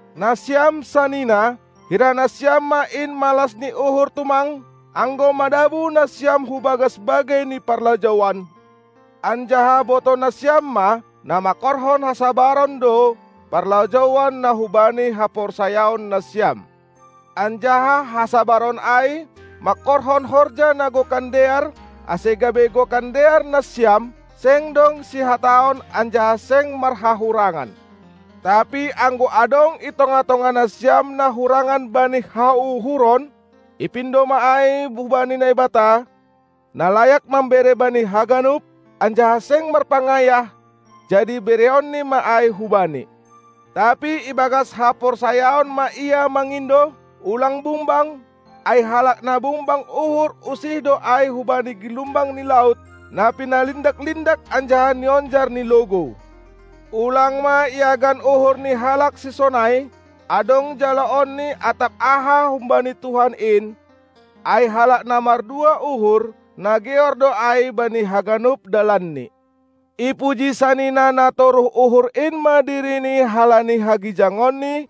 Nasiam sanina, hira nasiam ma in malas ni uhur tumang, anggo madabuh nasiam hu bagas bagei ni parlajouan, anjaha botoh nasiam ma, na mangkorhon hasabaron do parlajouan na hubani haporsayaon nasiam. Anjaha hasabaron ai mangkorhon horja na gokan dear, ase gabe gokan dear nasiam, seng dong sihataon anjaha seng marhahurangan. Tapi anggo adong i tongah-tongah nasiam na hurangan bani hauhuron, ipindo ma ai hubani Naibata, na layak mambere bani haganup, anjaha seng marpangayah, jadi bereonni ma ai hubani. Tapi ibagas haporsayaon ma ia mangindo, ulang bungbang, ai halak na bungbang uhur usih do ai hubani gilumbang ni laut, na pinalindak-lindak anjaha nionjar ni logou. Ulang ma iagan uhur ni halak sisonai, adong jaloonni atap aha humbani Tuhan in, ai halak na mardua uhur, na geor do ai bani haganup dalanni. Ipuji sanina na toruh uhur in ma dirini halani hagijangonni,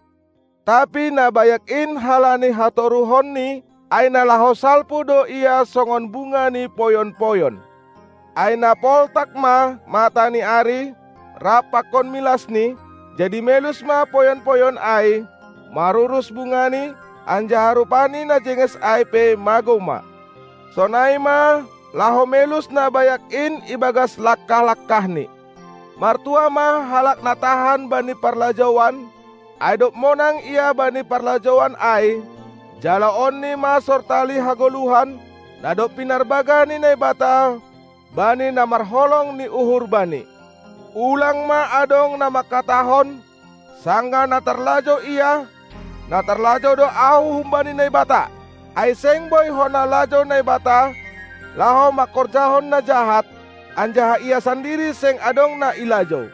tapi na bayak in halani hatoruhonni; ai na laho salpu do ia songon bunga ni poyon-poyon. Ai na poltak ma mata ni ari rap pakon milasni, jadi melus ma poyon-poyon ai, marurus bungani, anjaha rupani na jenges ai pe magou ma. Sonai ma laho melus na bayak in ibagas langkah-langkahni. Martuah ma halak na tahan bani parlajouan, ai dob monang ia bani parlajouan ai, jaloonni ma sortali hagoluhan, na dob pinarbagah ni Naibata bani na marholong ni uhur Bani. Ulang ma adong na mangkatahon, sanggah na tarlajou ia: Na tarlajou do ahu humbani Naibata! Ai seng boi hona lajou Naibata laho mangkorjahon na jahat, anjaha Ia sandiri seng adong na ilajou.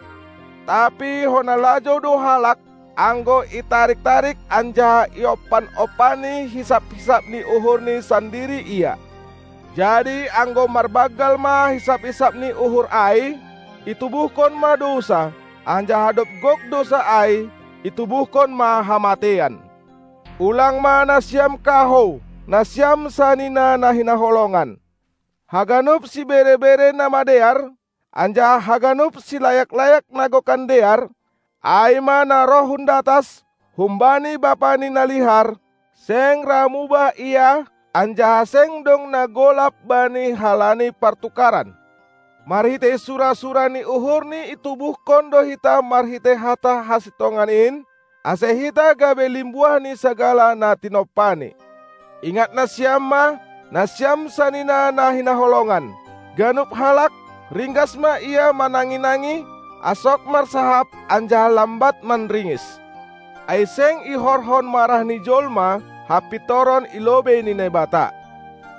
Tapi hona lajou do halak, anggo itarik-tarik anjaha iompan-ompani hisap-hisap ni uhurni sandiri ia. Jadi anggo marbanggal ma hisap-hisap ni uhur ai, itubuhkon ma dousa, anjaha dob gok dousa ai, itubuhkon ma hamateian. Ulang ma nasiam kahou, nasiam sanina na hinaholongan. Haganup sibere-bere na madear, anjaha haganup silayak-layak na gokan dear, ai ma na roh hun datas, humbani Bapa ni na lihar; seng ra mubah Ia anjaha seng dong na golap Bani halani partukaran. Marhitei sura-sura ni uhurNi itubuhkon do hita marhitei hata hasintongan in, ase hita gabe limbuah ni sagala na tinompaNi. Ingat nasiam ma, nasiam sanina na hinaholongan: Ganup halak, ringgas ma ia manangi-nangi, asok marsahap anjaha lambat manringis. Ai seng ihorhon marah ni jolma hapintoran i lobei ni Naibata.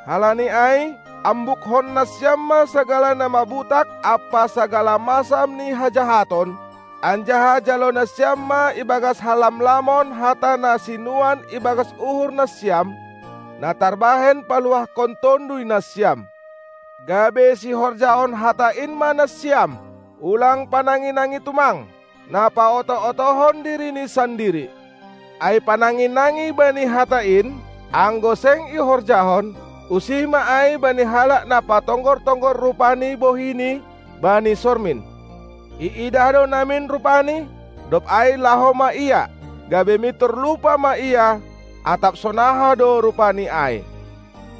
Halani ai ambukkon nasiam ma sagala na mabutak ampa sagala masam ni hajahaton, anjaha jalo nasiam ma ibagas halamlamon hata na sinuan ibagas uhur nasiam, na tarbahen paluahkon tonduy nasiam. Gabe sihorjahon hata in ma nasiam, ulang panangi-nangi tumang, na paoto-otohon dirini sandiri. Ai panangi-nangi bani hata in, anggo seng ihorjahon, usih ma ai bani halak na patonggor-tonggor rupa ni bohini bani sormin. Iidah do namin rupani, dob ai laho ma ia, gabe mintor lupa ma ia, atap sonaha do rupani ai.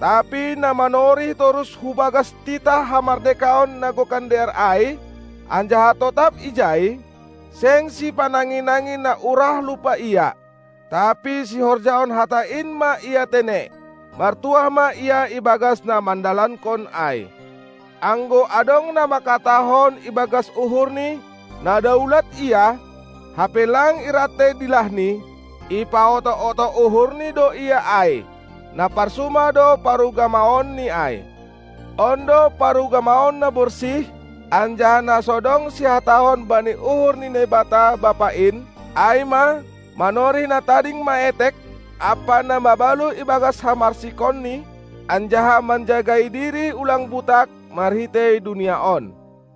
Tapi na manorih torus hu bagas titah hamardekaon na gokan dear ai, anjaha totap ijai, seng sipanangi-nangi na urah lupa ia, tapi sihorjahon hata in ma ia tene, martuah ma ia ibagas na mandalankon ai. Anggo adong na mangkatahon ibagas uhurni, na daulat ia, hape lang irantei dilahni, ipaoto-oto uhurni do ia ai, na parsuma do parugamaonni ai. On do parugamaon na borsih anjaha na so dong sihataon bani uhur ni Naibata, Bapa in, ai ma manorih na tading maetek ampa na mabalu ibagas hamarsikonni, anjaha manjagai diri ulang butak marhitei dunia on.